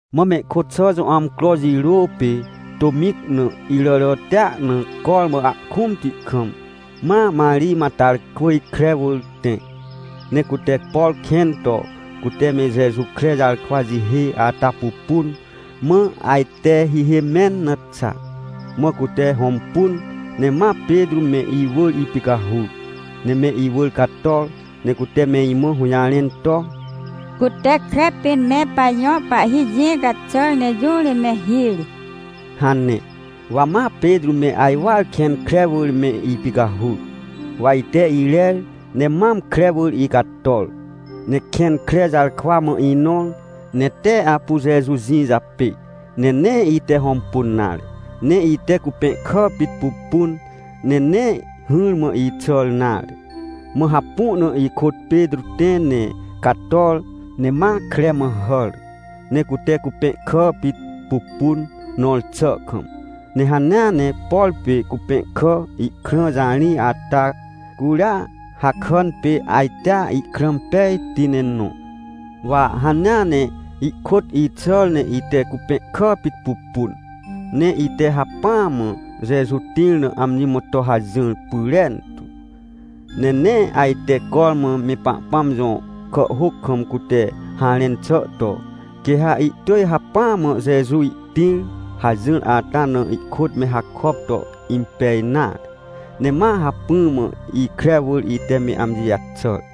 Mã mehkôt xà jõ amcro jirô pê, tômĩc na, iràràtia na cormã ahkũmti kam, ma Marij Matarkwỳj kre wỳr tẽ. Ne cute, por kẽn to cute me Jeju kre jarkwa jihê ata pupun, mã ajte hihê mẽn na xa. Mã cute hõmpun ne ma Petrô me, iwỳr ipicahur. Ne me iwỳr cator ne cute me imã hũjarẽn to: — Cute kre pĩn me pajõ Pahhi jĩ caxàr ne jũ ri me hir! — hane. Wa ma Petrô me ajwar kẽn kre wỳr me ipicahur, waite irer ne mam kre wỳr icator. Ne kẽn kre jarkwa mã inõr, ne tee apu Jeju jĩ japê, ne nee ite hõmpun nare. Ne ite cupẽhkà pit pupun, ne nee hỹrmã ixàr nare. Mã hapu na ikôt Petrô tẽ ne cator, ne ma kre mã hàr. Ne cute cupẽhkà pit pupun, nõr xà kam. Ne hanea ne, por pê cupẽhkà ihkrã jarij ata, curia hakàn pê ajtea ihkrã pejti ne nõ. Wa hanea ne ihkôt ixàr ne ite cupẽhkà pit pupun, ne ite hacpỹa mã Jeju tĩr na amji mã to hajỹr pyrentu. Ne nee ajte cormã me Pahpãm jõ kàhhôc kam cute harẽn xà to: “Quê ha ihtỳj hacpỹa mã Jeju ihtĩr” hajỹr ata na ihkôt me hakop to impej nare. Ne ma hacpỹ mã ikre wỳr ite me amji jaxàr.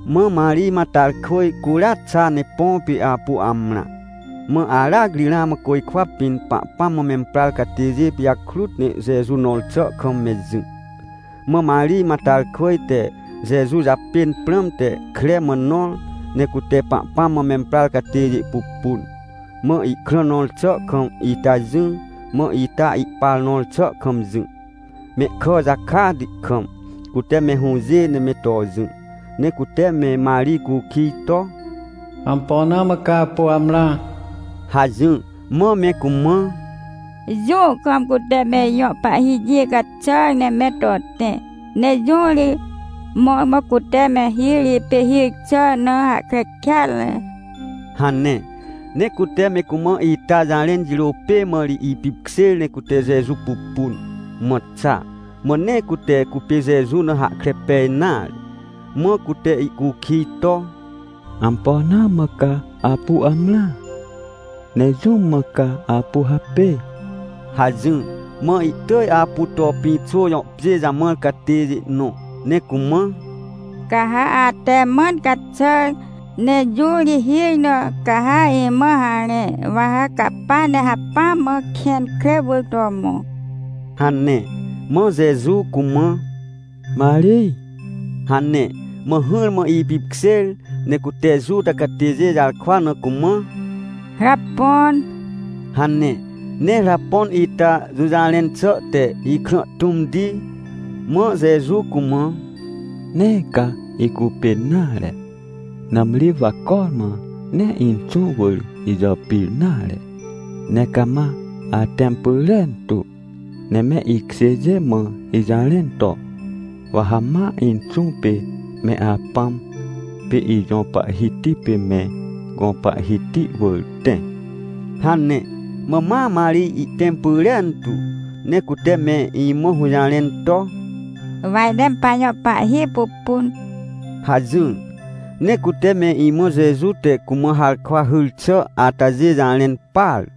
Mã Marij Matarkwỳj curia xa ne põ pê apu amrã. Mã aracri ramã côjkwa pĩn Pahpãm mã memprar catêjê pijakrut ne Jeju nõr xà kam me jỹ. Mã Marij Matarkwỳj te Jeju japên prãmte kre mã nõr, ne cute Pahpãm mã memprar catêjê pupun. Mã ihkrã nõr xà kam ita jỹ, mã ita ihpar nõr xà kam jỹ, mehkà jakati kam, cute me hũjê ne me to jỹ. Ne cute me Marij cukij to: — Ampo na mã ca apu amrã? — hajỹr. Mã me cumã: — Jũ kam cute me ijõ Pahhi jĩ caxàr ne me to tẽ, ne jũ ri mõrmõ cute me hir, ipê hir xà na hahkre kêatre! — hane. Ne cute me cumã ita jarẽn jirô pê mã ri ipipkjêr ne cute Jeju pupun, mã xa, mã nee cute cupê Jeju na hahkre pej nare. Mã cute ihcukij to: — Ampo na mã ca apu amrã? Ne jũm mã ca apu hapê? — hajỹr. Mã ihtỳj apu to pĩxô jõ pjê jamãr catêjê nõ, ne cumã: — Ca ha ate mãn caxàr ne jũ ri hir na, ca ha imã harẽ, wa ha capa ne hacpỹa mã kẽn kre wỳr to mõ — hane. Mã Jeju cumã: — Marij — hane. Mã hỹrmã ipipkjêr, ne cute Juta catêjê jarkwa na cumã: — Rapõn! — hane, ne Rapõn ita jũjarẽn xà te “Ikrã tũmti!” Mã Jeju cumã: — Nee ca icupên nare, nãmri wa cormã nee Inxũ wỳr ijàpir nare. Ne cama atẽm pyrentu ne me ikjêjê mã ijarẽn to: “Wa ha ma Inxũ pê me Apãm, pê ijõ Pahhiti pê me gõ Pahhiti wỳr tẽ” — hane. Mã ma Marij ihtẽm pyrentu, ne cute me imã hũjarẽn to: — Wa ite me pajõ Pahhi pupun — hajỹr. Ne cute me imã Jeju te cumã harkwa hyr xà atajê jarẽn par.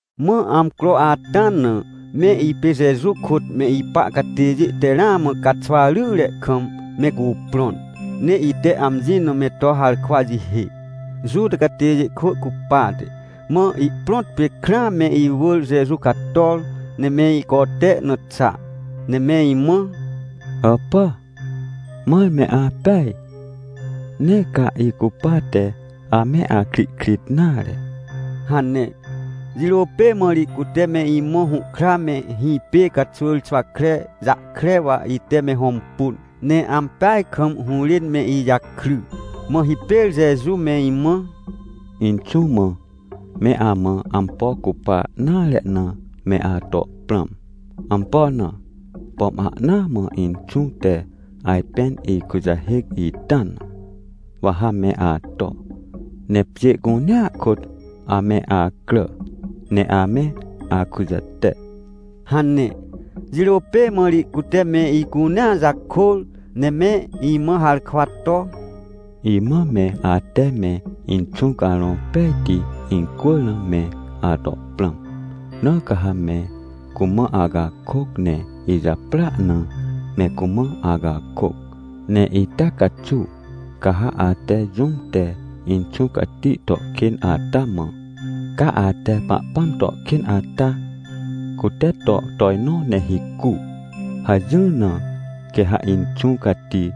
Mã amcro ata na, me ipê Jeju kôt me ipa catêjê te ramã caxwa ryre kam me cuprõn, ne ite amji na me to harkwa jihê, Juta catêjê kwỳ cupate. Mã ihprõt pê, krãa, me iwỳr Jeju cator ne me icote na xa, ne me imã: — Hàpà, mãr me apeaj? Nee ca icupate ame akrihkrit nare — hane. Jirô pê mã ri cute me imã hũhkra me hĩpê caxwỳr xwakre jahkre, wa ite me hõmpun, ne ampeaj kam hũrên me ijakry. Mã hipêr Jeju me imã: — Inxũ mã, me amã ampo cupa nare na me ato prãm. Ampo na? Pom ahnaa mã Inxũ te ajpên ikujahêc ita na, wa ha me ato, ne pjê cunea kôt ame acrà ne ame akujate — hane. Jirô pê mã ri cute me icunea jakôr, ne me imã harkwa to: — Imã me ate me Inxũ Carõ Pejti incwỳr na me ato prãm. Na ca ha me cumã acakôc ne ijaprỳa na me cumã acakôc. Ne ita caxuw, ca ha ate jũm te Inxũ Cati to kên ata mã: “Ca ate Pahpãm to kên ata, cute to tojnõ ne hicu” hajỹr na, quê ha Inxũ Cati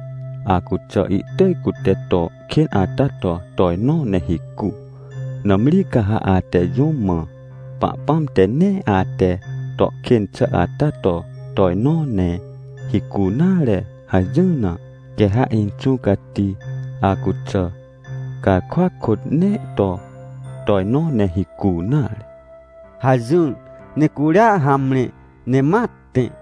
acuxà ihtỳj cute to kên ata to tojnõ ne hicu. Nãmri ca ha ate jũm mã: “Pahpãm te nee ate to kên xà ata to tojnõ ne hicu nare” hajỹr na, quê ha Inxũ Cati acuxà, garkwa kôt nee to tojnõ ne hicu nare — hajỹr, ne curia hamre, ne ma tẽ.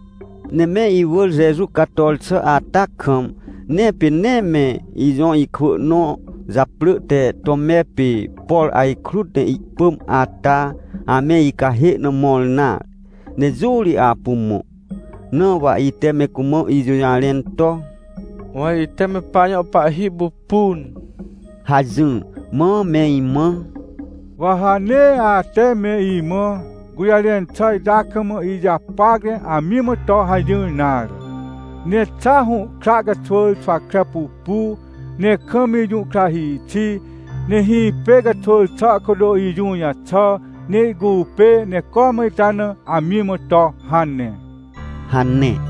Ne me iwỳr Jeju cator xà ata kam, ne pê nee me ijõ ikwỳ nõ japrỳ te Tome pê, por ajkrut ne ihpỳm ata, ame icahê na mõr nare, ne jũ ri apu mõ. Na wa ite me cumã ijũjarẽn to: — Wa ite me pajõ Pahhi pupun! — hajỹr. Mã me imã: — Wa ha nee ate me imã gũjarẽn xà ita kam ijapac ne amji mã to hajỹr nare. Ne xa hũhkra caxwỳr xwakre pupu, ne kam ijũhkrahhi xi, ne hĩpê caxwỳr xà kôt ijũ jaxà ne ihcupê, ne cormã ita na amji mã to hane — hane.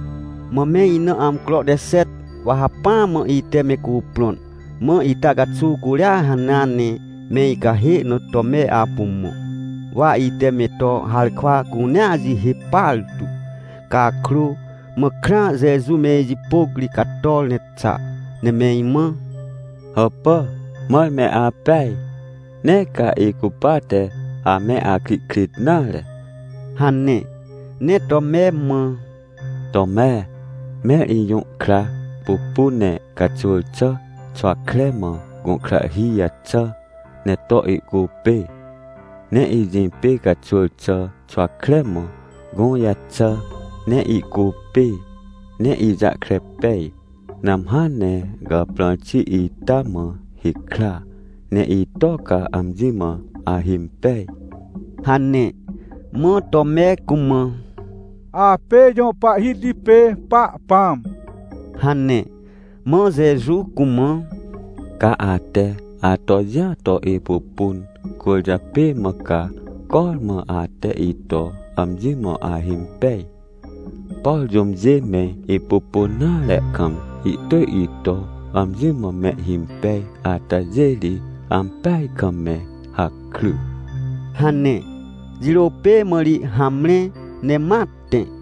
Mã me ina amcro te xet, wa hacpỹa mã ite me cuprõn, mã ita caxuw curia hanea ne me icahê na Tome apu mõ. Wa ite me to harkwa cunea jihê partu cakrô, mã krãa, Jeju me ijipôc ri cator ne xa, ne me imã: — Hàpà, mãr me apeaj? Nee ca icupate ame akrihkrit nare — hane. Ne Tome mã: — Tome, mẽr ijũhkra pupu ne caxwỳr xà xwakre mã gũhkrahhi jaxà ne to ihcupê. Ne ijĩpê caxwỳr xà xwakre mã gũ jaxà ne ihcupê ne ijahkre pej. Nãmhã ne gàprãr xi ita mã hikra, ne ito ca amji mã ahimpej! — hane. Mã Tome cumã: — Apê ijõ Pahhiti pê Pahpãm — hane. Mã Jeju cumã: — Ca ate ato jĩa to ipupun, cwỳrjapê mã ca cormã ate ito amji mã ahimpej. Por jũmjê me ipupun nare kam ihtỳj ito amji mã mehhimpej atajê ri ampeaj kam me hakry! — hane, jirô pê mã ri hamre ne ma tẽ.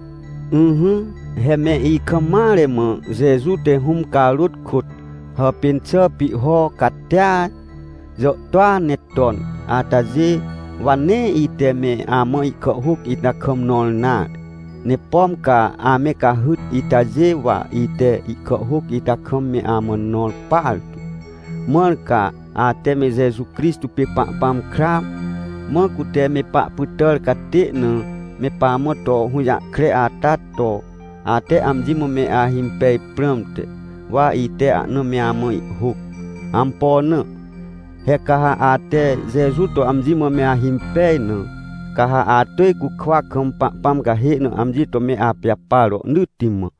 Ỹhỹ, he me ikam mare mã Jeju te Hũm carôt kôt hàpên xà pihho catia jàhtôa ne ton atajê, wa nee ite me amã ihkàhhôc ita kam nõr nare. Ne pom ca ame cahyt itajê, wa ite ihkàhhôc ita kam me amã nõr partu, mãr ca ate me Jeju Crixtô pê Pahpãm kra, mã cute me pahpytàr catê na me pamã to hũjahkre ata to, ate amji mã me ahimpej prãmte, wa ite ahna me amã ihhôc. Ampo na? He ca ha ate Jeju to amji mã me ahimpej na, ca ha atỳj cukwa kam Pahpãm cahê na amji to me apijapar rohnỳtti mã.